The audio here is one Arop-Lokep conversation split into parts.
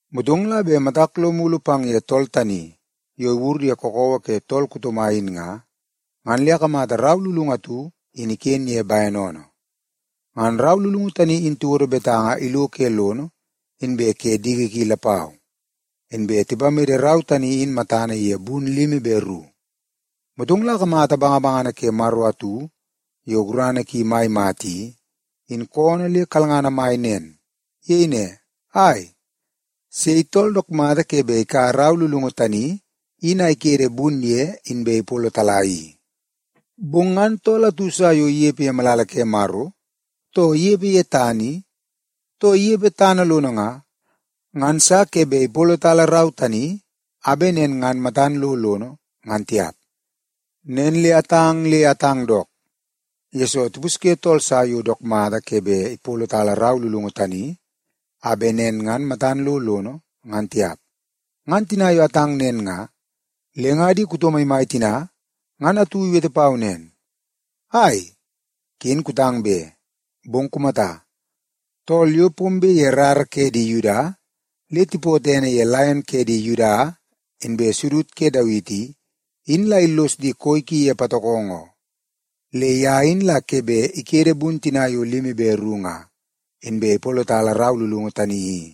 Motong la bet matak lo mulu pang ye tool tani yo iwur ye kakawa ke tool kuto mai in nga, ngan le akamata rau lulungu atu iken ye bene oonoo. Ngan rau lulungu tani in tiwodo betanga ilo ke lono inbe ke diki ki lapau, inbe tipamede rau tani in matana ye bun limi be ru. Motong la akamata bangabangana ke Maro atu yo gurana ki mai mata i, in koonoo le kalngana mai nen. Iyei ne, “Ai, sei tool dook mata ke bet ikaua rau lulungu tani in a ikede bun ye inbe ipolotala i?” Bong ngan tool atu sa yo inepe ye malala ke Maro, too inepe ye tana i, too inepe tana lono nga, ngan sa ke bet ipolotala rau tani a bet nen ngan matan lo lono, ngan tiap. Nen le atang le atang dook, yesoo tipusye tool sa yo dook mata ke bet ipolotala rau lulungu tani a bet nen ngan matan lo lono, ngan tiap. Ngan tina yo atang nen nga, le nga di kuto maimai tina ngan atu iwete pau nen, “Ai, ken kutang be! Bong kumata, tool yo pombe ye rara ke di Yuda le tipootoo ene ye Laion ke di Yuda inbe Sudud ke Dawiti i, in la illos di koi ki ye patokongo oo. Le ye in la ke bet ikede bun tina yo limi be ru nga, inbe ipolotala rau lulungu tani i.”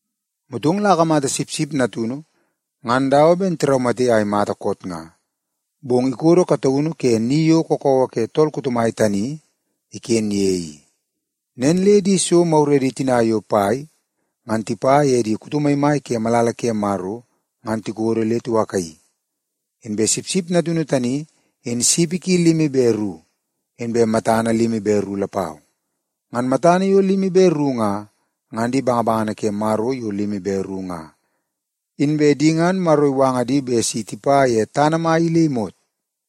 Motong la akamata Sipsip Natunu ngan dawa ben tiraumate a imata koot nga, bong ikodo kataunu ke ni yo kakawa ke tool kuto mai tani iken ye i. Nen le di so maguredi tina yo pai ngan tipa ye di kuto maimai ke malala ke Maro ngan tikodo le tiwakaii. Inbe Sipsip Natunu tani in sipi ki limi be ru inbe matana limi be ru lapau. Ngan matana yo limi be ru nga, ngan di bangabangana ke Maro yo limi be ru nga. Inbe di ngan Maro iwanga di bet si tipa ye tana mai i le imot.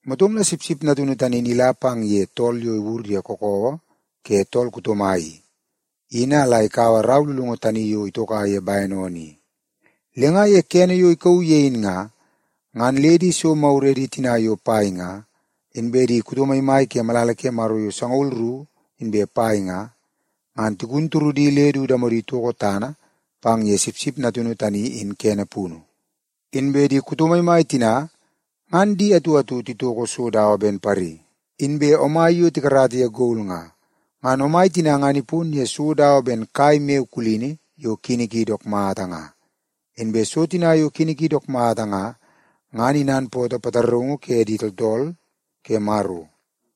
Motong la Sipsip Natunu tani in ila pang ye tool yo iwur ye kakawa ke tool kuto mai i, in a la ikaua rau lulungu tani yo itoka ye bene oonoo i. Le nga ye kene yo ikauu ye in nga, ngan le di so maguredi tina yo pai nga, inbe di kuto maimai ke malala ke Maro yo sangaul ru inbe pai nga, ngan tigun turudi le du damodi itoko tana pang ye Sipsip Natunu tani in kene punu. Inbe di kuto maimai tina ngan di atu atu titoko so dawa ben pari inbe omai yo tikarata ye gol nga. Ngan omai tina ngan ipon ye so dawa ben kai maiyo kulini yo kini ki dook mata nga. Inbe so tina yo kini ki dook mata nga, ngan inanpootoo pataraungu ke di tooltool ke Maro.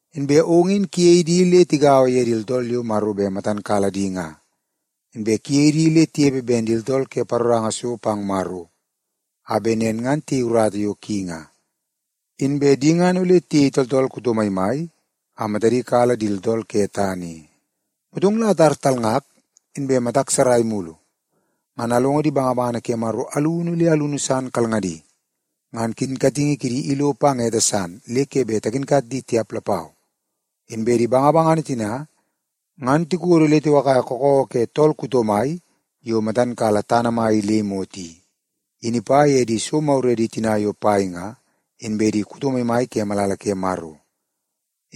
Inbe ong in kuyei di le tigaua ye di tooltool yo Maro bet matan kala di nga, inbe kuyei di le tinepe ben di tooltool ke paroranga so pang Maro a bet nen ngan tiyei urata yo ki nga. Inbe di ngan ole tiyei tooltool kuto maimai a matadi kala di tooltool ke tana i.” Motong la atar talngak inbe matak sarai mulu, ngan alongo di bangabangana ke Maro alunu le alunu san kalngadi. Ngan kinkatingi kidi ilo pang ete san le ke bet takinkat di tiap lapau. Inbe di bangabangana tina ngan tikodo le tiwakaia kakawa ke tool kuto mai yo matan kala tana mai i le imot i, in ipa ye di so maguredi tina yo pai nga, inbe di kuto maimai ke malala ke Maro.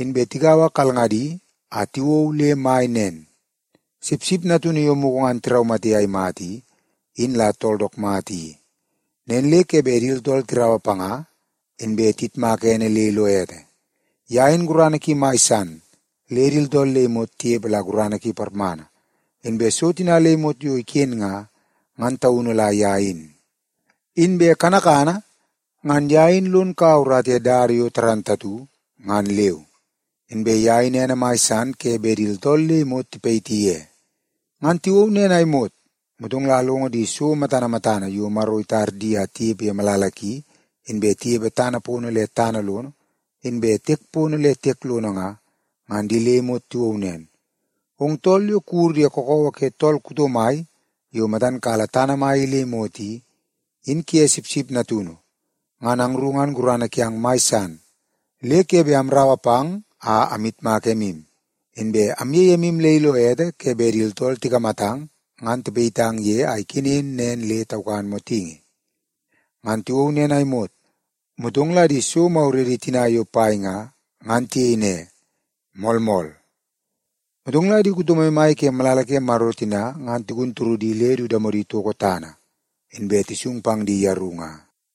Inbe tigaua kalngadi a tiwou le mai nen, “Sipsip Natunu yo mugu ngan tiraumate a imata i, in la tool dook mata i. Nen le ke bet di tooltool tiraua panga, inbe tiyitmaka ene le ilo ete. Ye in gurana ki mai san le di tooltool le imot tinepe la gurana ki parmana. Inbe so tina le imot yo iken nga, ngan taunu la ye in. Inbe kanakana ngan ye in lon kaua urata ye dada yo dook mata ngan leu. Inbe ye in ene mai san ke bet di tooltool le imot tipayiti ye.” Ngan tiwou nen a imot, motong la alongo di so matana matana yo Maro itar di a tinepe ye malala ki, inbe tinepe tana pono le tana lono, inbe tinepe tiek pono le tiek lono nga, ngan di le imot tiwou nen, “Ong tool yo kuwur ye kakawa ke tool kuto mai yo matan kala tana mai i le imot i, in kuye Sipsip Natunu, ngan angru ngan gurana kiang mai san le ke bet amraua pang a amyitmak emu, inbe amyei emu le ilo ete ke bet di tooltool tikamatang ngan tipayitang ye a ikenen nen le taukan motingi!” Ngan tiwou nen a imot, motong la di so maguredi tina yo pai nga, ngan tiyei ne, “Moolmool.” Motong la di kuto maimai ke malala ke Maro tina ngan tigun turudi le du damodi toko tana, inbe tisung pang di yeru nga.